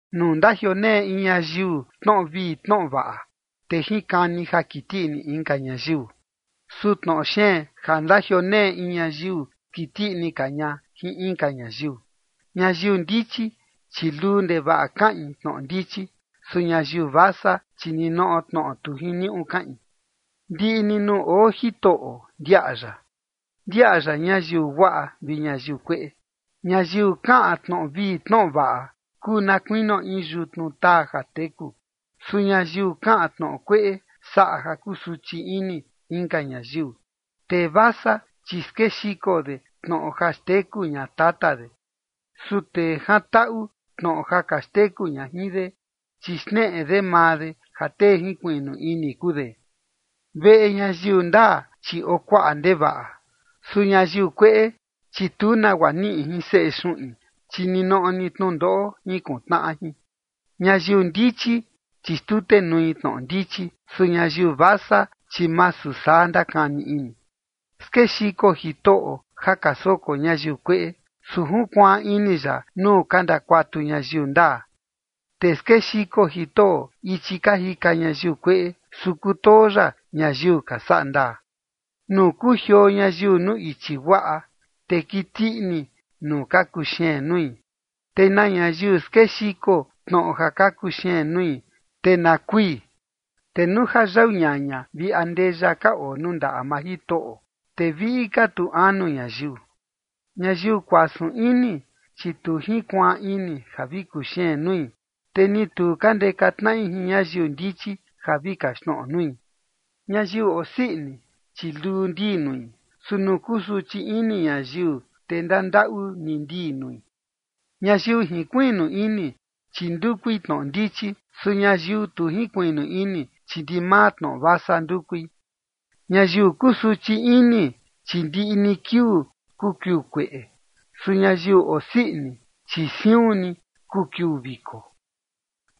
Nuu ndajioneꞌe in ñayiu tnoꞌo vii tnoꞌo vaꞌa, te jinkani ja kiti ini inka ñayiu. Su tnoꞌo xeen ja ndajioneꞌe in ñayiu skiti ini ka ña jin inka ñayiu. Ñayiu ndichi, chi luu ndevaꞌa kaꞌin tnoꞌo ndichi. Su ñayiu vasa, chi ninoꞌo tnoꞌo tu jiniuꞌu kaꞌin. Ndiꞌi ni nuu oo Jitoꞌo ndiaꞌa ya, ndiaꞌa ya ñayiu guaꞌa vi ñayiu kueꞌe. Ñayiu kaꞌan tnoꞌo vii tnoꞌo vaꞌa kuu na kuinio in yutnu taa ja teku. Su ñayiu kaꞌan tnoꞌo kueꞌe, saꞌa ja kusuchi ini inka ñayiu. Tee vasa, chi skexiko de tnoꞌo ja xteku ña tata de. Su tee jantaꞌu tnoꞌo ja ka xteku ña jin de, chi xneꞌe de maa de ja tee jinkuiꞌnu ini kuu de. Veꞌe ñayiu ndaa, chi oo kuaꞌa ndevaꞌa. Su ñayiu kueꞌe, chi tu nagua niꞌi jin seꞌe xuꞌin, chi ninoꞌo ni tnundoꞌo jinkuntnaꞌa jin. Ñayiu ndichi, chi xtutenui tnoꞌo ndichi. Su ñayiu vasa, chi masu saa ndakani ini. Skexiko Jitoꞌo ja ka soko ñayiu kueꞌe, su junkuaan ini ya nuu ka ndakuatu ñayiu ndaa. Te skexiko Jitoꞌo ichi ka jika ñayiu kueꞌe, su kutoo ya ñayiu ka saꞌa ndaa. Nuu kujioo ñayiu nuu ichi guaꞌa, te kiti ini nuu ka kuxeen nui, te na ñayiu skexiko tnoꞌo ja ka kuxeen nui, te na kui. Te nuu ja yau ñaña vi andeya ka oo nuu ndaꞌa maa Jitoꞌo, te viꞌi ka tu anu ñayiu. Ñayiu kuasun ini, chi tu jinkuaan ini ja vi kuxeen nui, te ni tu ka ndeka tnaꞌi jin ñayiu ndichi ja vi kaxtnoꞌo nui. Ñayiu osii ini, chi luu ndii nui. Su nuu kusuchi ini ñayiu, te ndandaꞌu ni ndii nui. Ñayiu jinkuiꞌnu ini, chi ndukui tnoꞌo ndichi. Su ñayiu tu jinkuiꞌnu ini, chi ndimaa tnoꞌo vasa ndukui. Ñayiu kusuchi ini, chi ndiꞌi ni kiuu kuu kiuu kueꞌe. Su ñayiu osii ini, chi siun ni kuu kiuu viko.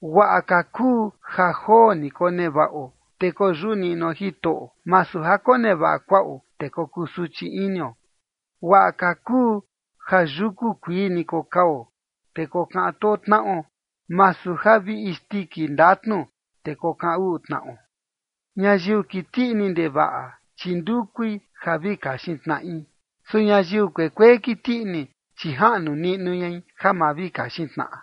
Guaꞌa ka kuu ja joo ni konevaꞌo, te koyuꞌu niꞌnuo Jitoꞌo, masu ja konevaꞌa kuaꞌo, te kokusuchi inio. Guaꞌa ka kuu ja yuku kuii ni kokao, te kokaꞌan too tnaꞌo, masu ja vi in isndiki ndatnu, te kokaꞌan uꞌu tnaꞌo. Ñayiu kiti ini ndevaꞌa, chi ndukui ja vi kaxin tnaꞌi. Su ñayiu kuekuee kiti ini, chi jaꞌnu niꞌnu ñai ja ma vi kaxin tnaꞌa.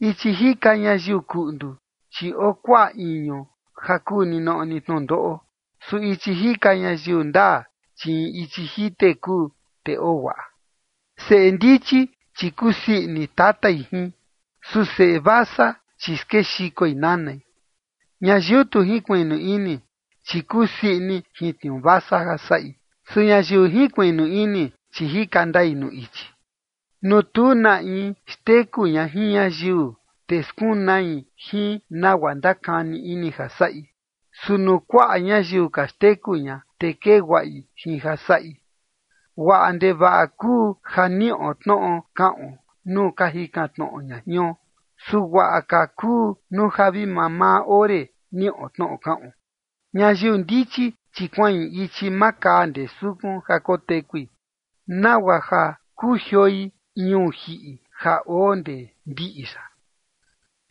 Ichi jika ñayiu kuꞌndu, chi oo kuaꞌa iñu ja kuu ninoꞌo ni tnundoꞌo. Su ichi jika ñayiu ndaa, chi in ichi jite kuu, te oo guaꞌa. Seꞌe ndichi, chi kusii ini tatai jin. Su seꞌe vasa, chi skexikoi nanai. Ñayiu tu jinkuiꞌnu ini, chi kusii ini jin tniuu vasa ja saꞌi. Su ñayiu jinkuiꞌnu ini, chi jika ndai nuu ichi. Nuu tu na in xteku ña jin ñayiu, te skunai jin nagua ndakani ini ja saꞌi. Su nuu kuaꞌa ñayiu ka xteku ña, te kee guaꞌi jin ja saꞌi. Guaꞌa ndevaꞌa kuu ja niꞌo tnoꞌo kaꞌon nuu ka jikan tnoꞌo ña jion, su guaꞌa ka kuu nuu ja vi mamaa ore niꞌo tnoꞌo kaꞌon. Ñayiu ndichi, chi kuaꞌin ichi makaa ndee sukun ja kotekui, nagua ja kujioi ñuu jiꞌi ja oo ndee ndiꞌi yaꞌa.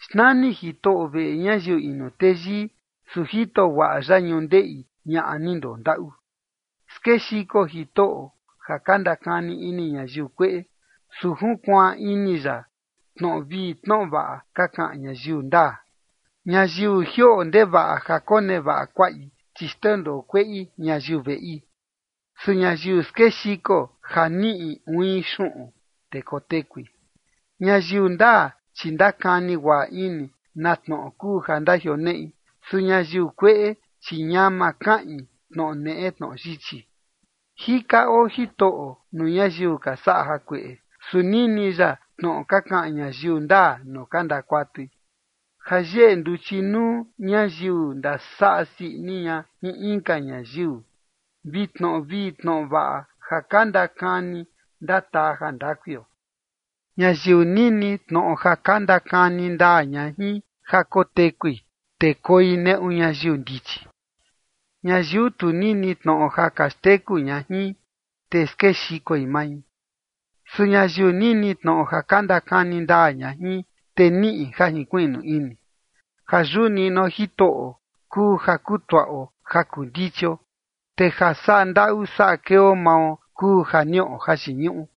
Xnani Jitoꞌo veꞌe ñayiu inu teyii, su jito guaꞌa ya ñundeꞌi ñaꞌa ni ndondaꞌu. Skexiko Jitoꞌo ja ka ndakani ini ñayiu kueꞌe, su junkuaan ini ya tnoꞌo vii tnoꞌo vaꞌa ka kaꞌan ñayiu ndaa. Ñayiu jioꞌo ndevaꞌa ja konevaꞌa kuaꞌi, chi xndendoo kueꞌi ñayiu veꞌi. Su ñayiu skexiko ja niꞌi uin xuꞌun, te kotekui. Ñayiu ndaa, chi ndakani guaꞌa ini na tnoꞌo kuu ja ndajioneꞌi. Su ñayiu kueꞌe, chi ñama kaꞌin tnoꞌo neꞌe tnoꞌo yichi. Jika oo Jitoꞌo nuu ñayiu ka saꞌa jakueꞌe. Su nini ya tnoꞌo ka kaꞌan ñayiu ndaa nuu ka ndakuatui. Ja yeꞌe nduchi nuu ñayiu ndasaꞌa sii ini ña jin inka ñayiu, te tnoꞌo vii tnoꞌo vaꞌa ja ka ndakani, ndataa jandakuio. Ñayiu nini tnoꞌo ja ka ndakani ndaa ña jin ja kotekui, te koi neꞌu ñayiu ndichi. Ñayiu tu nini tnoꞌo ja ka xteku ña jin, te skexikoi mai. Su ñayiu nini tnoꞌo ja ka ndakani ndaa ña jin, te niꞌi ja jinkuiꞌnu ini. Ja yuꞌu niꞌnuo Jitoꞌo kuu ja kutuaꞌo ja kuu ndichio, te ja saꞌa ndaꞌu saꞌa keo mao kuu ja niꞌo jayiñuꞌu.